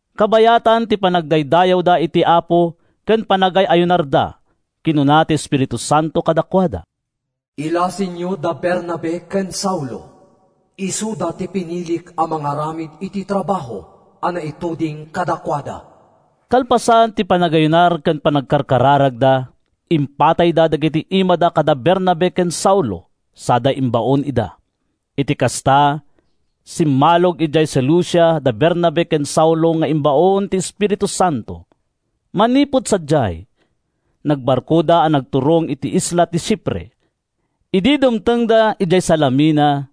Kabayatan ti panagdaydayawda iti Apo ken panagay-ayunarda, kinuna ti Espiritu Santo kadakuada, “Ilasinyo da Bernabe ken Saulo. Isuda ti pinilik a mangaramid iti trabaho a naituding kadakuada.” Kalpasan ti panagayunar ken panagkararagda, impatayda dagiti imada kada Bernabe ken Saulo sada imbaon ida. Iti kasta, simmalog idiay Seleucia da Bernabe ken Saulo nga imbaon ti Espiritu Santo. Manipud sadiay, nagbarkoda a nagturong iti isla ti Chipre. Idi dumtengda idiay Salamina,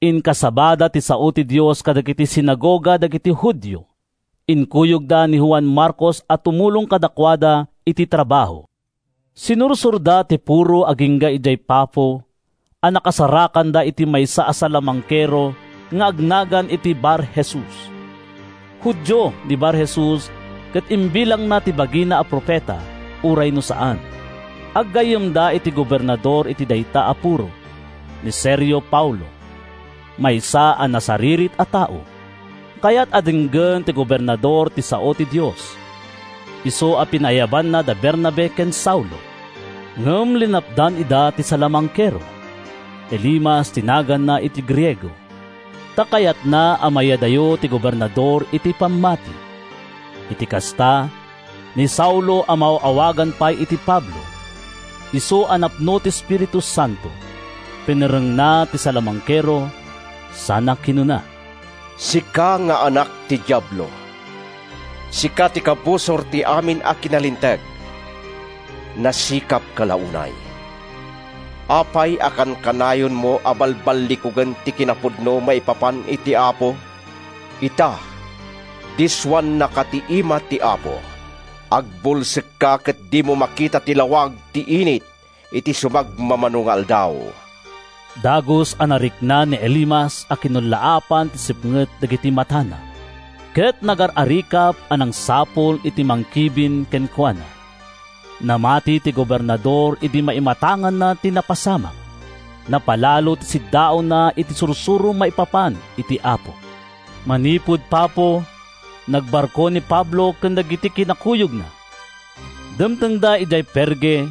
inkasabada ti sao ti Dios kadagiti sinagoga dagiti Judio. Inkuyogda ni Juan Marcos a tumulong kadakuada iti trabaho. Sinursorda ti puro agingga idiay Pafo a nakasarakanda iti maysa a salamangkero nga agnagan iti Bar-Jesus. Judio ni Bar-Jesus ket imbilangna ti bagina a profeta uray no saan. Aggayyemda iti gobernador iti dayta a puro, ni Sergio Paulo, maysa a nasaririt a tao. Kayat a denggen ti gobernador ti sao ti Dios, isu a pinaayabanna da Bernabe ken Saulo. Ngem linapdan ida ti salamangkero (Elimas ti naganna iti Griego), ta kayatna a mayadayo ti gobernador iti pammati. Iti kasta, ni Saulo a maaw-awagan pay iti Pablo, isu a napno ti Espiritu Santo, pinerrengna ti salamangkero sana kinuna: “Sika nga anak ti Diablo! Sika ti kabusor ti amin a kinalinteg. Nasikapka la unay. Apay a kankanayonmo a balballikugen ti kinapudno maipapan iti Apo? Ita, dissoannaka ti ima ti Apo: Agbulsekka ket dimo makita ti lawag ti init iti sumagmamano nga aldaw.” Dagus a narikna ni Elimas a kinullaapan ti sipnget dagiti matana, ket nagar-arikap a nangsapul iti mangkibin kenkuana. Namati ti gobernador idi maimatanganna ti napasamak. Napalalo ti siddaawna iti sursuro maipapan iti Apo. Manipud Pafo, nagbarko ni Pablo ken dagiti kinakuyogna. Dimtengda idiay Perge,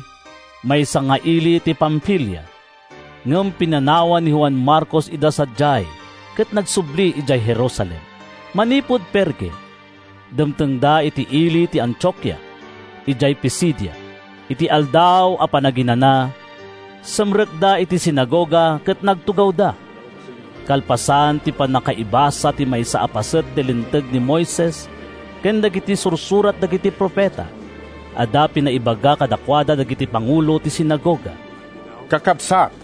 maysa nga ili iti Pamfilia. Ngem pinanawan ni Juan Marcos ida sadiay ket nagsubli idiay Jerusalem. Manipud Perge, dimtengda iti ili ti Antiokia, idiay Pisidia. Iti Aldaw a Panaginana, simrekda iti sinagoga ket nagtugawda. Kalpasan ti pannakaibasa ti maysa a paset ti Linteg ni Moises ken Dagiti Sursurat dagiti Profeta, adda pinaibaga kadakuada dagiti pangulo ti sinagoga. “Kakabsat,”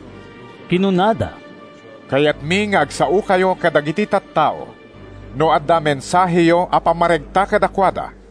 kinunada, “kayatmi nga agsaokayo kadagiti tattao, no adda mensaheyo a pammaregta kadakuada.”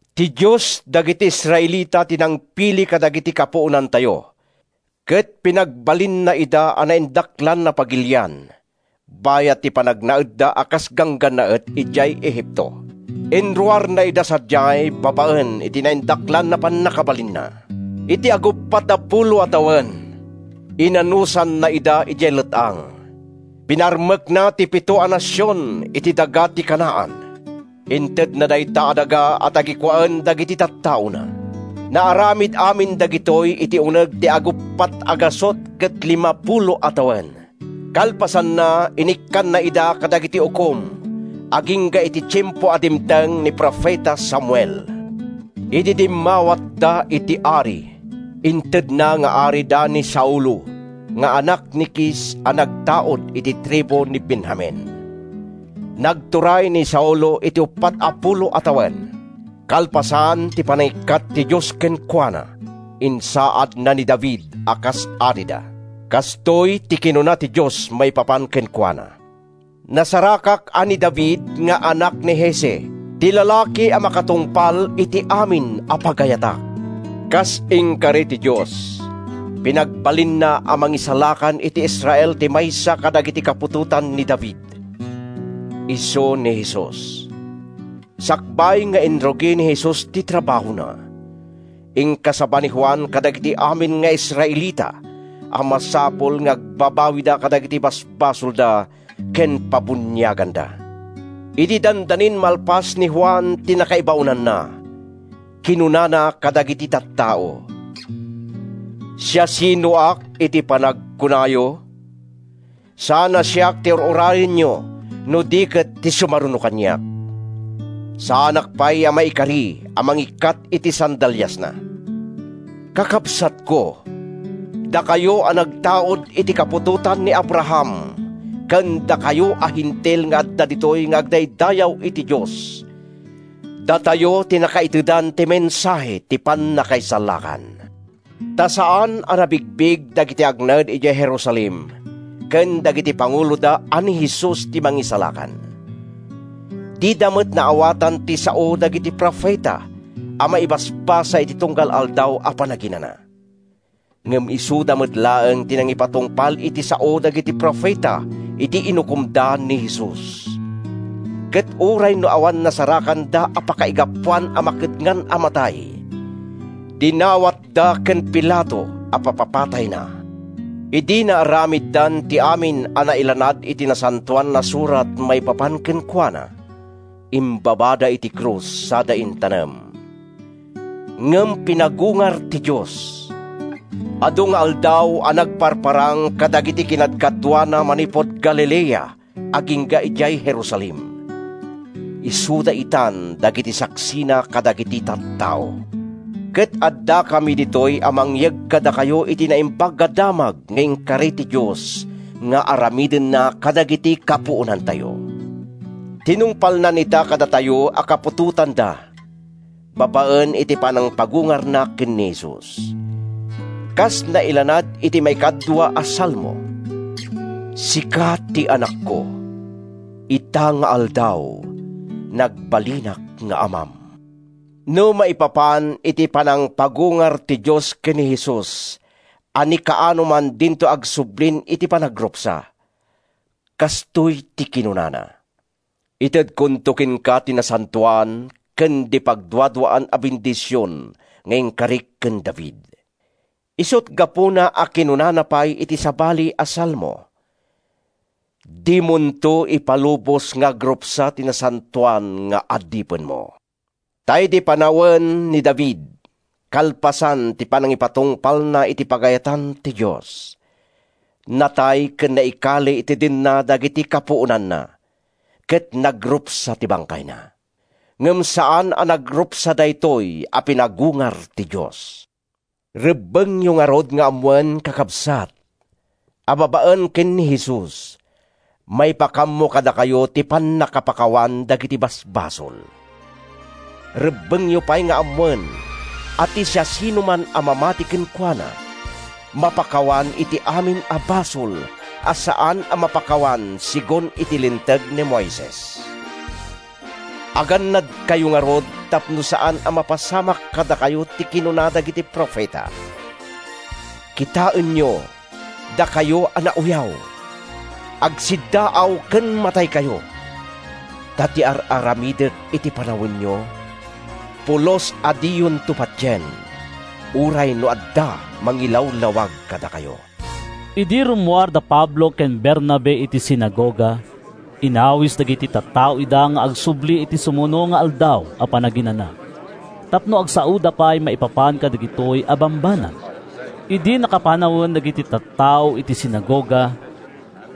Ti Dios dagiti Israelita ti nangpili kadagidi kapuonantayo ket pinagbalinna ida a naindaklan a pagilian bayat ti panagnaedda a kas ganggannaet idiay Egipto. Inruarna ida sadiay babaen iti naindaklan a pannakabalinna. Iti aguppat a pulo a tawen, inanusanna ida idiay let-ang. Pinarmekna ti pito a nasion iti daga ti Canaan. Intedna dayta a daga a tagikuaen dagiti tattaona. Naaramid amin dagitoy iti uneg ti ag-450 a tawen. “Kalpasanna, inikkanna ida kadagiti ukom agingga iti tiempo a dimteng ni profeta Samuel. Idi dimmawatda iti ari, intedna nga arida ni Saulo nga anak ni Kis a nagtaud iti tribu ni Benjamin. Nagturay ni Saulo iti uppat a pulo a tawen. Kalpasan ti panangikkat ti Dios kenkuana, insaadna ni David a kas arida. Kastoy ti kinuna ti Dios maipapan kenkuana, ‘Nasarakak a ni David nga anak ni Jesse ti lalaki a makatungpal iti amin a pagayatak!’ “Kas inkari ti Dios, pinagbalinna a Mangisalakan iti Israel ti maysa kadagiti kaputotan ni David. Isu ni Jesus. Sakbay nga inrugi ni Jesus ti trabahona, inkasaba ni Juan kadagiti amin nga Israelita a masapul nga agbabawida kadagiti basbasolda ken pabuniaganda. Idi dandanin malpas ni Juan ti nakaibaonanna, kinunana kadagiti tattao, ‘Siasinoak iti panagkunayo? Saan a siak ti ur-urayenyo no di ket ti sumaruno kaniak. Saanak pay a maikari a mangikkat iti sandaliasna.’ “Kakabsatko, dakayo a nagtaud iti kaputotan ni Abraham ken dakayo a Hentil nga adda ditoy nga agdaydayaw iti Dios: datayo ti nakaitedan ti mensahe ti pannakaisalakan! Ta saan a nabigbig dagiti agnaed idiay Jerusalem ken dagiti panguloda a ni Jesus ti Mangisalakan. Dida met naawatan ti sao dagiti profeta a maibasbasa iti tunggal Aldaw a Panaginana. Ngem isuda met laeng ti nangipatungpal iti sao dagiti profeta idi inukomda ni Jesus. Ket uray no awan nasarakanda a pakaigapuan a makedngan a matay, dinawatda ken Pilato a papapatayna. Idi naaramiddan ti amin a nailanad iti Nasantoan a Surat maipapan kenkuana, imbabada iti krus sada intanem. “Ngem pinagungar ti Dios. Adu nga aldaw a nagparparang kadagidi kinadkaduana manipud Galilea agingga idiay Jerusalem. Isuda itan dagiti saksina kadagiti tattao. Ket addakami ditoy a mangyeg kadakayo iti Naimbag a Damag nga inkari ti Dios nga aramidenna kadagiti kapuonantayo. Tinungpalnan ita kadatayo a kaputotanda babaen iti panangpagungarna ken ni Jesus. Kas nailanad iti maikadua a Salmo: ‘Sika ti Anakko; Ita nga aldaw, nagbalinak nga Amam.’ No maipapan iti panangpagungar ti Dios ken ni Jesus a ni kaanoman dinto agsublin iti panagrupsa, kastoy ti kinunana: ‘Itedkonto kenka ti nasantoan ken di pagduaduaan a bendision nga inkarik ken David.’ Isut’ gapuna a kinunana pay iti sabali a salmo: ‘Dimonto ipalubos nga agrupsa ti nasantoan nga adipenmo.’ Ta idi panawen ni David, kalpasan ti panangipatungpalna iti pagayatan ti Dios, natay ken naikali iti denna dagiti kapuonanna, ket nagrupsa ti bangkayna. Ngem saan a nagrupsa daytoy a pinagungar ti Dios. Rebbengyo ngarud nga ammoen, kakabsat, a babaen ken ni Jesus, maipakaammo kadakayo ti pannakapakawan dagiti basbasol. Rebbengyo pay nga ammoen a ti siasinoman a mamati kenkuana mapakawan iti amin a basol a saan a mapakawan segun ti Linteg ni Moises. Agannadkayo ngarud tapno saan a mapasamak kadakayo ti kinuna dagiti profeta: ‘Kitaenyo, dakayo a nauyaw! Agsiddaaw ken mataykayo! Ta ti ar-aramidek iti panawenyo, Pulos a diyonto patien, Uray no adda mangilawlawag kadakayo.’” Idi rummuar da Pablo ken Bernabe iti sinagoga, inawis dagiti tattao ida nga agsubli iti sumuno nga Aldaw a Panaginana tapno agsaoda pay maipapan kadagitoy a bambanag. Idi nakapanawen dagiti tattao iti sinagoga,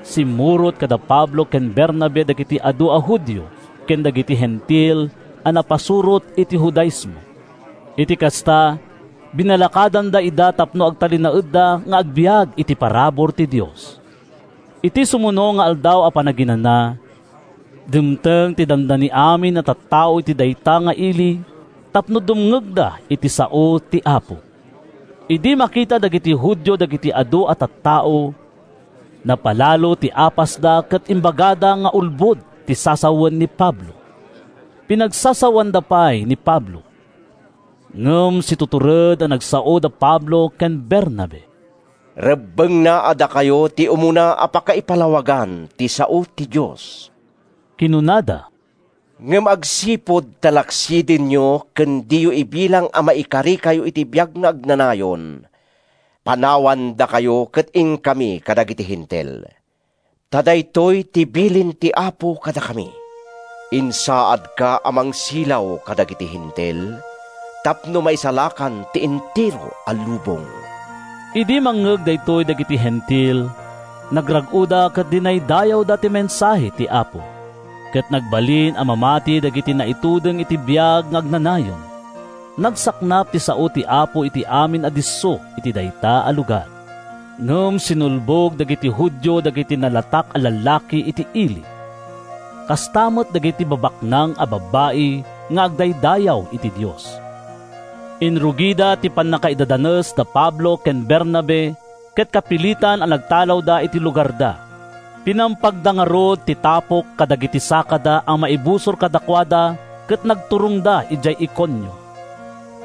simmurot kada Pablo ken Bernabe dagiti adu a Judio ken dagiti Hentil a napasurot iti Judaismo. Iti kasta, binalakadanda ida tapno agtalinaedda nga agbiag iti parabur ti Dios. Iti sumuno nga Aldaw a Panaginana, dimteng ti dandani amin a tattao iti dayta nga ili tapno dumngegda iti sao ti Apo. Idi makita dagiti Judio dagiti adu a tattao, napalalo ti apasda ket imbagada nga ulbod ti sasawen ni Pablo. Pinagsasaoanda pay ni Pablo. Ngem situtured a nagsao da Pablo ken Bernabe. “Rebbengna a dakayo ti umuna a pakaipalawagan ti sao ti Dios,” kinunada, “ngem agsipud ta laksidenyo ken diyo ibilang a maikarikayo iti biag nga agnanayon, panawandakayo ket inkami kadagiti Hentil. Ta daytoy ti bilin ti Apo kadakami: ‘Insaadka a mangsilaw kadagiti Hentil, Tapno maisalakan ti entero a lubong.’” Idi mangngeg daytoy dagiti Hentil, nagrag-oda ket dinaydayawda ti mensahe ti Apo. Ket nagbalin a mamati dagiti naituding iti biag nga agnanayon. Nagsaknap ti sao ti Apo iti amin a disso iti dayta a lugar. Ngem sinulbog dagiti Judio dagiti nalatak a lallaki iti ili, kasta met dagiti babaknang a babbai nga agdaydayaw iti Dios. Inrugida ti pannakaidadanes da Pablo ken Bernabe ket kapilitan a nagtalawda iti lugarda. Pinampagda ngarud ti tapok kadagiti sakada a maibusor kadakuada ket nagturongda idiay Iconio.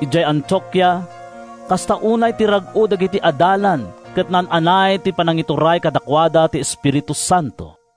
Idiay Antiokia, kasta unay ti rag-o dagiti adalan ket naan-anay ti panangituray kadakuada ti Espiritu Santo.